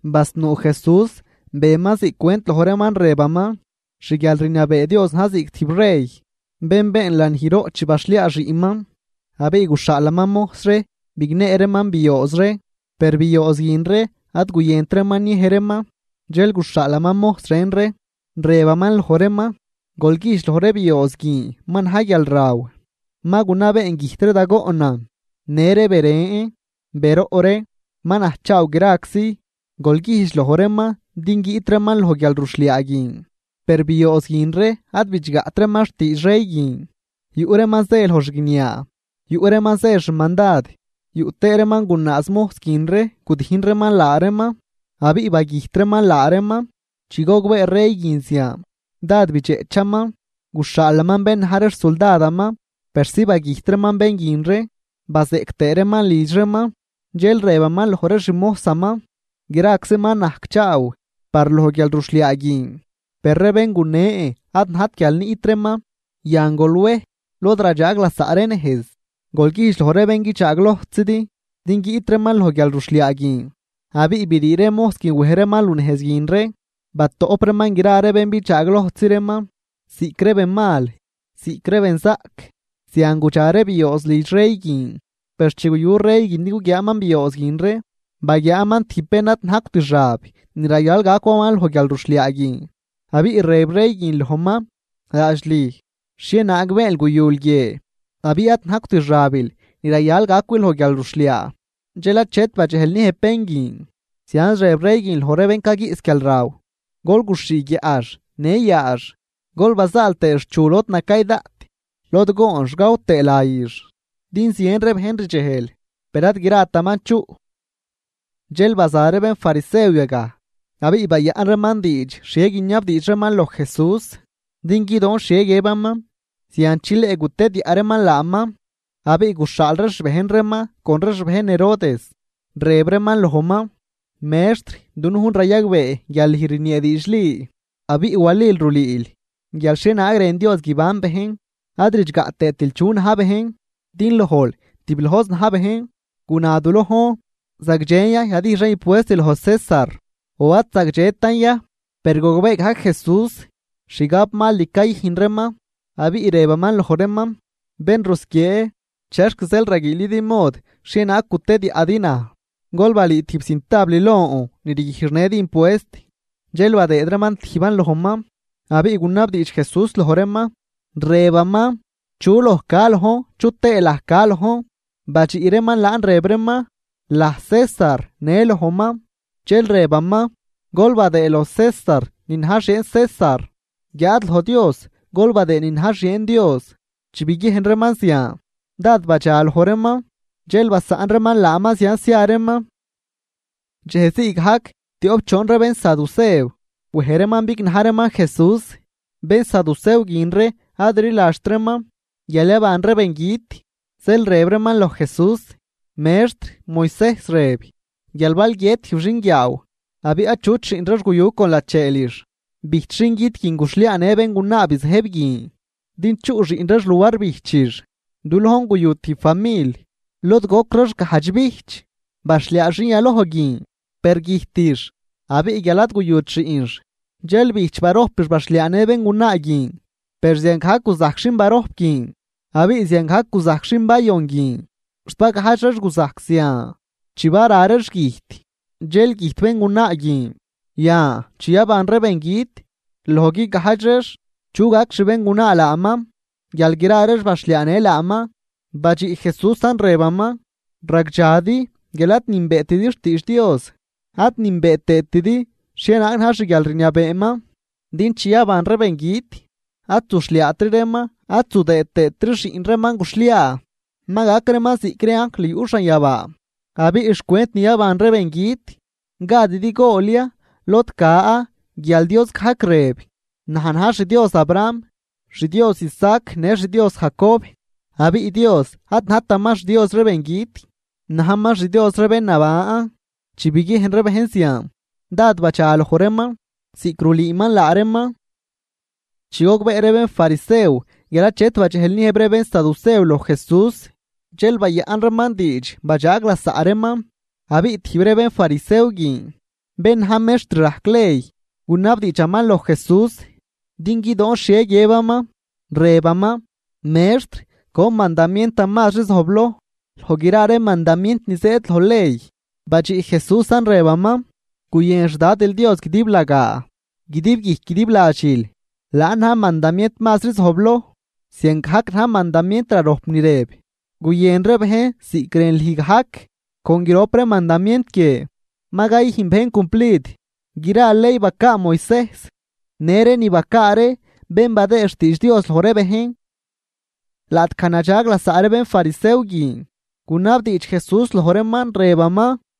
Basnuu Jesús beman ziꞌc cwent loj reeman rëbaman: ―Xguialrniabee Dios na̱j ziꞌc tijb rey bén been lanijroꞌ chi baxhliaa xiꞌnman. Abiꞌ guxhaalaman mojs ree bignee reeman biooz ree, per biooz guin ree ad guyënt reeman niej reeman. Dxel guxhaalaman mojs ren ree, rëbaman loj reeman: “Gol güjdx loj ree biooz guin ma na̱j guialraw, ma gunabeen güjt ree da goꞌnan në ree beren, beroꞌ ree. Ma najcchaaw graczi, gol güjdx loj reeman din guiꞌt reeman loj guialruxhliaa guin.” Per biooz guin ree ad bidxgaꞌt reeman xtiidx rey guin, yuꞌ reeman zë loj xguiniaa, yuꞌ reeman zë xmandad, yuꞌ tëë reeman gunaaz mojs guin ree gudijn reeman laa reeman abiꞌ bagüjt reeman laa reeman. Chi gogbee rey guin zian, dád bidxeꞌchaman. Guxhaalaman bén na̱j ree xsuldadaman persi bagüjt reeman bén guin ree bazeꞌc tëë reeman lidx reeman. Dxel rëbaman loj ree xmojsaman: “Graczi ma najcchaaw par loj guialruxhliaa guin, per ree bén gunen ad najt guial niꞌt reeman. Yan, gol wej lod radxaag lasaꞌ ree nejz, gol güjdx loj ree bén guidxaalojtzidi din guiꞌt reeman loj guialruxhliaa guin.” Abiꞌ brii ree mojs guin wej reeman lunejz guin ree, batoꞌp reeman gra ree bén bidxaalojtzi reeman, ziꞌc ree benmal ziꞌc ree benzaꞌc, zian gudxa ree biooz lidx rey guin. ’Per chi guyu rey guin din guguiaaman biooz guin ree, baguiaaman tijb bén ad najcwt xab ni rayal gacwaman loj guialruxhliaa guin. Abiꞌ rëb rey guin lojman: “Laadx lüj, ¿xhienaag beenl guyul guie abiꞌ ad najcwt xabil ni rayal gacwil loj guialruxhliaa?” Dxel achet badxejl niëjb bén guin. Zianz rëb rey guin loj ree bén caguiꞌs guialraw: “Gol guxhii guiaꞌx në yaax, gol bazaal tëëx xchu lod nacay daꞌt lod goonx gaw tëë layix.” Din zien ree bejn rdxejl, per ad grataman chuꞌ. Dxel baza ree bénfarisew yagaj, abiꞌ bayaꞌn reeman diidx xhie guiniabdiidx reeman loj Jesús din guidoon xhie guiëbaman, zian chileꞌ gutediaꞌ reeman laaman. Abiꞌ guxhaal ree xbejn reeman con ree xbejn Herodes, rëb reeman lojman: ―Mextr, dunujn rayagbee guial lüj rniee diidxli, abiꞌ walil rulüül guial xhienaag rën Dios guiban bejn, ad ridxgaꞌ tëëtil chu na̱j bejn. Din lojl tiblojzi na̱j bejn. Guna du lojn: ¿Zagdxen ya yadijxan impuest loj César o ad zagdxetan ya? Per gogbee gajc Jesús xgabmal ni cayüjn reeman, abiꞌ rëbaman loj reeman: ―Bén rusquiee, ¿chexc zeel raguiilidi mod xhienaag gutidiaꞌdi naj? Gol balüü tijb cintabl lon ni rguijxnëdi impuest. Dxel badëëd reeman tijban lojman, abiꞌ gunabdiidx Jesús loj reeman, rëbaman: ―¿Chu loj ca lojn chu tëë laj ca lojn? Badxiꞌ reeman laan, rëb reeman: ―Laj César në lojman. Dxel rëbaman: ―Gol badëëd loj César ni na̱j xieen César, guiáad loj Dios gol badëëd ni na̱j xieen Dios. Chi biguiejn reeman zian, dád badxaloj reeman, dxel basaꞌn reeman laaman, zianz zia reeman. Dxejzii gajc tioꞌp choon ree bénsadusew wej reeman bignaj reeman Jesús, bénsadusew guin ree ad rliladxt reeman guial yaban ree bengüt, zeel rëb reeman loj Jesús: ―Mextr, Moisejs rëb guial bal guiët tijb xinguiaaw abiꞌ achut xiꞌn reex guyu con lacheelix, bijch xingüt guin guxhliaanë béngunaa bizëjb guin din chuꞌ xiꞌn reex luar bijchix. Du lojn guyu tijb famil lod gojc reex gajdx bijch. Baxhliaa xin yaloj guin, per güjtix abiꞌ guial ad guyut xiꞌnx, dxel bijch barojpix baxhliaanë béngunaa guin. Per ziangajc guzajc xin barojp guin abiꞌ ziangajc guzajc xin bayon guin, xt bagajdx reex guzajc zian. Chi bara reex güjt dxel güjt béngunaa guin. Yan, chi yaban ree bengüt, loj guigajdx reex, ¿chu gac xbéngunaa laaman guial gra reex baxhliaanë laaman? Badxiꞌ Jesúsan, rëbaman: ―¡Ragdxadi guial ad nünbeetidi xtiidx Dios ad nünbee tëëtidi xhienaag na̱j xguialrniabeeman! Din chi yaban ree bengüt, ad zuxhliaatri reeman ad zudëëd tëëtri xiꞌn reeman guxhliaa, ma gac reeman ziꞌc ree anjl yuꞌ xanyabaa. Abiꞌ xcwent ni yaban ree bengüt, ¿gadidi gool ya lod ca guial Dios gajc rëb: “Naj na̱j xDios Abraham, xDios Isaac në xDios Jacob”? Abiꞌ Dios ad najtaman xDios ree bengüt, najman xDios ree bén naban. Chi biguiejn ree bejn zian, dád badxaloj reeman ziꞌc rulüüman laa reeman. Chi gogbee ree bénfarisew guial achet badxejl niëjb ree bénsadusew loj Jesús, dxel bayaꞌn reeman diidx badxaag lasaꞌ reeman. Abiꞌ tijb ree bénfarisew guin, bén na̱j mextr rajc ley, gunabdiidxaman loj Jesús din guidoon xhie guiëbaman, rëbaman: ―Mextr, ¿con mandamientan mazri zojbloj loj gra ree mandamient ni zëëd loj ley? Badxiꞌ Jesúsan rëbaman: ―“Guyën xDadil Dios guidiblagaa guidib guijc guidib ladxil.” Laan na̱j mandamient mazri zojbloj. Ziangajc na̱j mandamient rarojp ni rëb: “Guyën ree bejn ziꞌc rën lüj gajc.” Con grop ree mandamient guie, ma cayüjn bejn cumplid gra ley bacaa Moisejs në ree ni bacaa ree bén badëë xtiidx Dios loj ree bejn. Laꞌtgaj nadxag lasaꞌ ree bénfarisew guin, gunabdiidx Jesús loj reeman, rëbaman: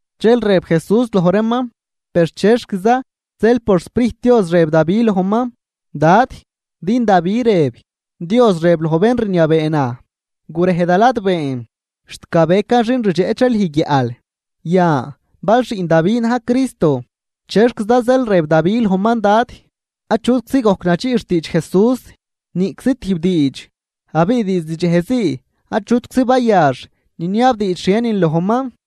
Dxel rëb Jesús loj reeman: ―Per, ¿chexquiza zeel por xSprijt Dios rëb Davi lojman, Dad? Din Davi rëb: Dios rëb loj bén rniabee naj: “Gurej da ladbeen, xt gabecan xin rdxeꞌch ree lüj guiaꞌl.” Yan, bal xiꞌn Davi na̱j Cristo, ¿chexquiza zeel rëb Davi lojman Dad? Achutczi gojc nadxiꞌ xtiidx Jesús, niꞌczi tijb diidx. Abiꞌ diizd dxejzii achutczi bayax niniabdiidx xhienin lojman.